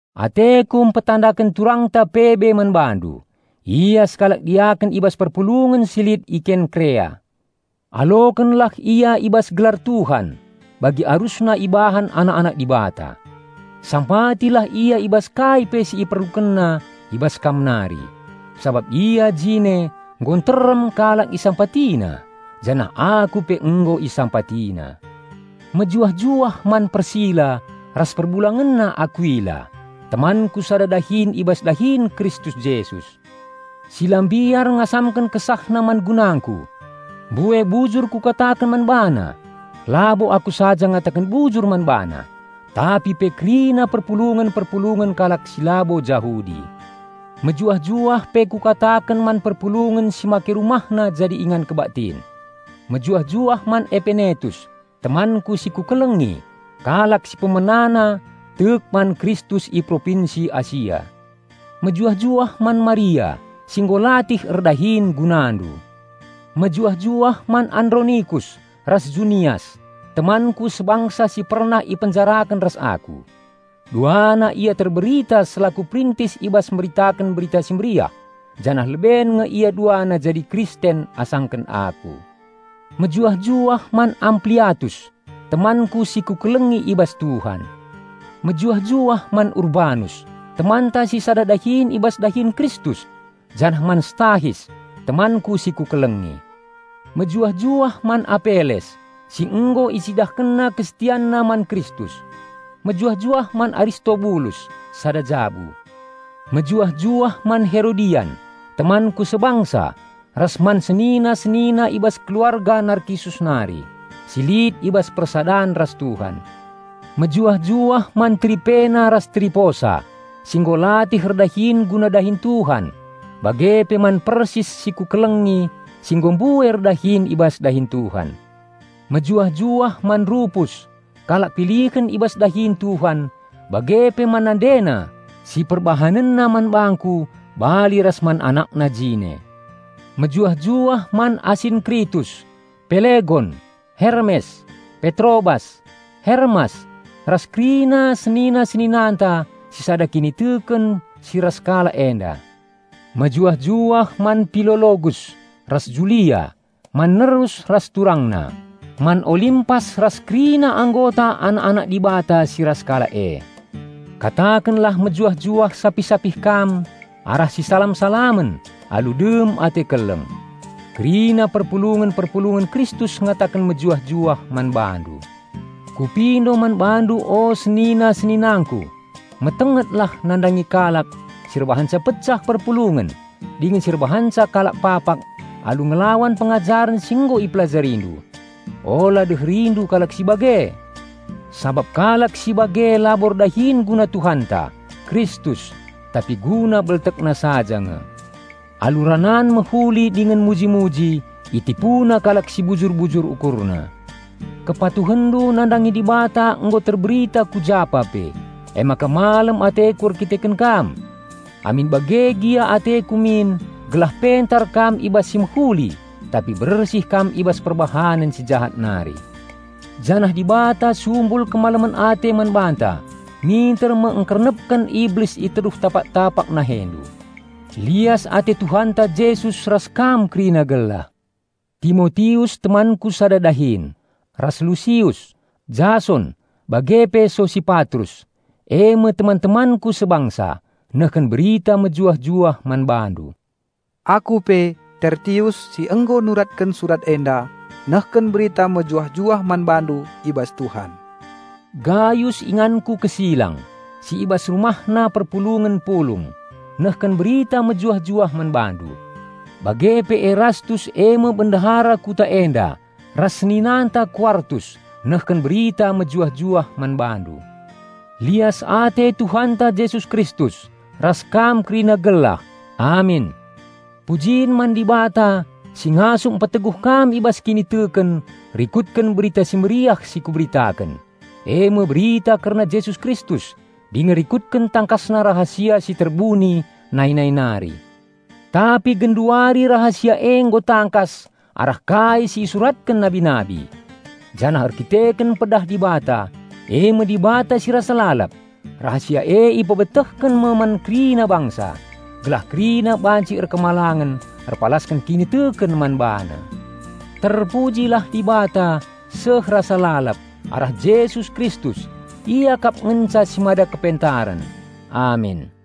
Ateku mpetandaken turangta Pebe man bandu. Ia sekalak diaken i bas perpulungen si lit i Kenkerea. Alokenlah ia i bas gelar Tuhan, bagi arusna ibahan anak-anak Dibata. Sampatilah ia i bas kai pe si iperlukenna i bas kam nari; sabap ia jine nggo nterem kalak isampatina janah aku pe nggo isampatina. Mejuah-juah man Persila ras perbulangenna Akuila, temanku sada dahin i bas dahin Kristus Jesus. Si la mbiar ngasamken kesahna man gunangku. Mbue bujur kukataken man bana, labo aku saja ngataken bujur man bana, tapi pe kerina perpulungen-perpulungen kalak si labo Jahudi. Mejuah-juah pe kukataken man perpulungen si make rumahna jadi ingan kebaktin. Mejuah-juah man Epenetus temanku si kukelengi, kalak si pemenana tek man Kristus i Propinsi Asia. Mejuah-juah man Maria si nggo latih erdahin gunandu. Mejuah-juah man Andronikus ras Junias, temanku sebangsa si pernah ipenjaraken ras aku. Duana ia terberita selaku perintis i bas meritaken Berita Si Mehuli janah leben nge ia duana jadi Kristen asangken aku. Mejuah-juah man Ampliatus, temanku si kukelengi i bas Tuhan. Mejuah-juah man Urbanus, temanta si sada dahin i bas dahin Kristus janah man Stahis temanku si kukelengi. Mejuah-juah man Apeles si nggo icidahkenna kesetianna man Kristus. Mejuah-juah man Aristobulus sada jabu. Mejuah-juah man Herodian, temanku sebangsa, ras man senina-senina i bas keluarga Narkisus nari si lit i bas persadan ras Tuhan. Mejuah-juah man Tripena ras Triposa si nggo latih erdahin guna dahin Tuhan, bage pe man Persis si kukelengi si nggo mbue erdahin i bas dahin Tuhan. Mejuah-juah man Rupus kalak pilihen i bas dahin Tuhan bage pe man nandena si perbahanenna man bangku bali ras man anakna jine. Mejuah-juah man Asinkritus, Pelegon, Hermes, Petrobas, Hermas, ras kerina senina-seninanta si sada kiniteken si ras kalak enda. Mejuah-juah man Pilologus ras Julia, man Nerus ras turangna, man Olimpas ras kerina anggota anak-anak Dibata si ras kalak e. Katakenlah mejuah-juah sapih-sapih kam arah sisalam-salamen alu dem ate keleng. Kerina perpulungen-perpulungen Kristus ngataken mejuah-juah man bandu. Kupindo man bandu o senina-seninangku: Metengetlah nandangi kalak si erbahanca pecah perpulungen dingen si erbahanca kalak papak alu ngelawan pengajaren si nggo ipelajarindu. Ula deherindu kalak si bage! Sabap kalak si bage labo erdahin guna Tuhanta, Kristus, tapi guna beltekna saja nge. Alu ranan mehuli dingen muji-muji itipuna kalak si bujur-bujur ukurna. Kepatuhenndu nandangi Dibata nggo terberita ku japa pe. Emaka malem ateku erkiteken kam. Amin bage gia ateku min gelah pentar kam i bas si mehuli tapi bersih kam i bas perbahanen si jahat nari. Janah Dibata sumbul kemalemen ate man banta minter me engkernepken Iblis i teruh tapak-tapak nahendu. Lias ate Tuhanta Jesus ras kam kerina gelah. Timotius temanku sada dahin, ras Lusius, Jason, bage pe Sosipatrus, eme teman-temanku sebangsa, nehken berita mejuah-juah man bandu. Aku pe, Tertius, si nggo nuratken surat enda, nehken berita mejuah-juah man bandu i bas Tuhan. Gayus inganku kesilang, si i bas rumahna perpulungen pulung, nehken berita mejuah-juah man bandu. Bage pe Erastus eme bendahara kuta enda ras seninanta Kuartus nehken berita mejuah-juah man bandu. Lias ate Tuhanta Jesus Kristus, ras kam kerina gelah! Amin. Pujin man Dibata si ngasup mpeteguh kam i bas kiniteken rikutken Berita Si Mehuli si kuberitaken, eme berita kerna Jesus Kristus dingen rikutken tangkasna rahasia si terbuni nai-nai nari. Tapi genduari rahasia e nggo tangkas arah kai si isuratken nabi-nabi. Janah erdandanken pedah Dibata, eme Dibata si rasa lalap, rahasia e ipebetehken me man kerina bangsa, gelah kerina banci patuh erpalasken kiniteken man BaNa. Terpujilah Dibata seh rasa lalap arah Jesus Kristus; Ia kap ngenca si mada kepentaren. Amin.